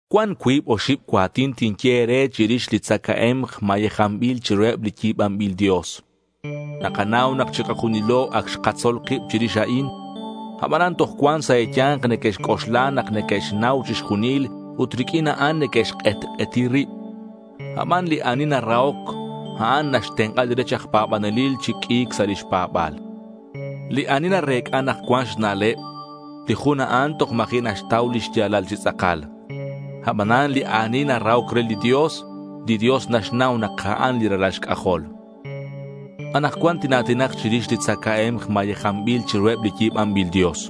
Cuan cuib oxib cua̱tin tinye e̱re chirix li tzacae̱mk mayejanbil chiruheb li yi̱banbil dios. Nakanau nak chikajunilo ac xkatzol kib chirix a'in. Abanan toj cuan sa' e̱ya̱nk neque'xc'oxla nak neque'xnau chixjunil ut riq'uin a'an neque'xk'etk'eti rib. Aban li ani narahoc, a'an naxtenk'a li rech aj pa̱banelil chi q'ui̱c sa' lix pa̱ba̱l. Li ani narec'a nak cuan xna'leb, li jun a'an toj ma̱ji' naxtau li xya̱lal chi tz'akal. Abanan li ani narahoc re li Dios, li Dios naxnau nak a'an li ralal xc'ajol. Anakcuan tina̱tinak chirix li tzacae̱mk mayejanbil chiruheb li yi̱banbil dios.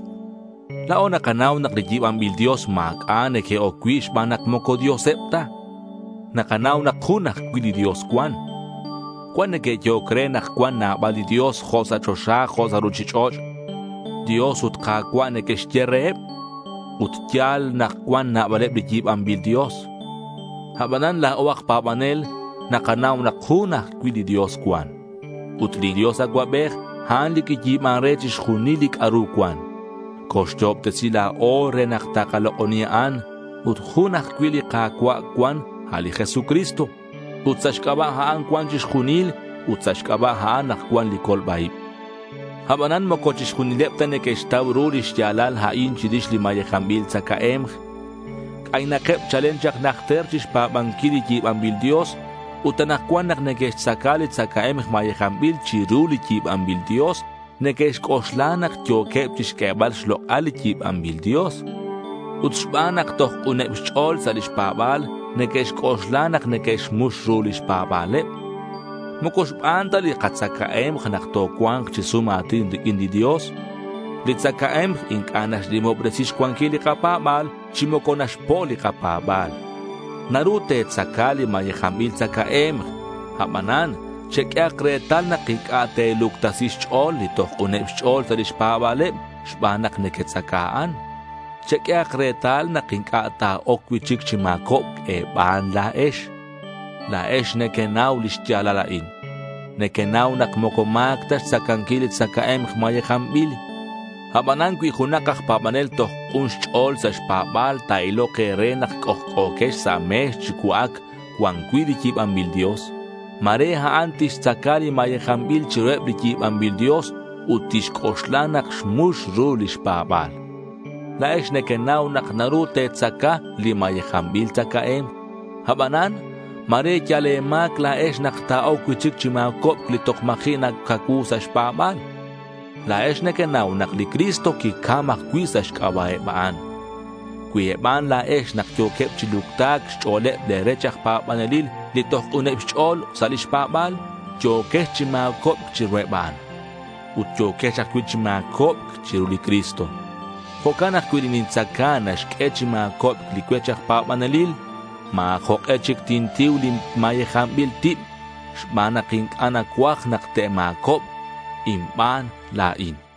La̱o nakanau nak li yi̱banbil dios ma̱c'a' neque'oc cui' xban nak moco dioseb ta. Nakanau nak jun ajcui' li Dios cuan. Cuan neque'yehoc re nak cuan nabal li dios jo' sa' choxa jo' sa' ruchich'och'. Dios ut Ka̱cua' neque'xye reheb. Ut ya̱l nak cuan nabaleb li yi̱banbil dios. Abanan la̱o aj pa̱banel nakanau nak jun ajcui' li Dios cuan. Ut li Dios Acuabej a'an li quiyi̱ban re chixjunil li c'a'ru cuan. Coxyo'obtesi la̱o re nak takalok'oni a'an. Ut jun ajcui' li Ka̱cua' cuan, a' li Jesucristo. Ut sa' xc'aba' a'an cuan chixjunil ut sa' xc'aba' a'an nak cuan li colba-ib. Abanan moco chixjunileb ta neque'xtau ru li xya̱lal a'in chirix li mayejanbil tzacae̱mk. C'aynakeb chalen chak najter chixpa̱banquil li yi̱banbil dios, ut anakcuan nak neque'xtzaca li tzacae̱mk mayejanbil chiru li yi̱banbil dios neque'xc'oxla nak yo̱queb chixq'uebal xlok'al li yi̱banbil dios. Ut xban nak toj k'uneb xch'o̱l sa' lix pa̱ba̱l, neque'xc'oxla nak neque'xmux ru lix pa̱ba̱leb. Moco xban ta li katzacae̱mk nak tocua̱nk chi sum a̱tin riq'uin li Dios. Li tzacae̱mk inc'a' naxnimobresi xcuanquil li kapa̱ba̱l chi moco naxpo' li kapa̱ba̱l. Naru te̱tzaca li mayejanbil tzacae̱mk. Abanan cheq'uehak retal nak inc'a' te̱luctasi xch'o̱l li toj k'uneb xch'o̱l sa' lix pa̱ba̱leb xban nak nequetzaca a'an. Cheq'uehak retal nak inc'a' ta̱oc cui'chic chi ma̱cobc e̱ban la̱ex. La̱ex nequenau li xya̱lal a'in. Nequenau nak moco ma̱c ta xtzacanquil li tzacae̱mk mayejanbil. Abanan cui junak aj pa̱banel toj k'un xch'o̱l sa' xpa̱ba̱l ta̱ilok e̱re nak c'ojc'o̱quex sa' me̱x chi cua'ac cuan cui' li yi̱banbil dios, ma̱re a'an tixtzaca li mayejanbil chiruheb li yi̱banbil dios ut tixc'oxla nak xmux ru lix pa̱ba̱l. La̱ex nequenau nak naru te̱tzaca li mayejanbil tzacae̱mk. Abanan, ma̱re yal e̱ma̱c la̱ex nak ta̱oc cui'chic chi ma̱cobc li toj ma̱ji' nacacuu sa' xpa̱ba̱l. La̱ex nequenau nak li Cristo quicam ajcui' sa' xc'aba' eb a'an. Cui e̱ban la̱ex nak yo̱queb chi lucta̱c xch'o̱leb le̱ rech aj pa̱banelil li toj k'uneb xch'o̱l sa' lix pa̱ba̱l, yo̱quex chi ma̱cobc chiruheb a'an. Ut yo̱quex ajcui' chi ma̱cobc chiru li Cristo. Jo'can nak cui li nintzaca naxq'ue chi ma̱cobc li cuech aj pa̱banelil, ma̱ jok'e chic tintiu li mayejanbil tib xban nak inc'a' nacuaj nak te'ma̱cobk inban la̱in.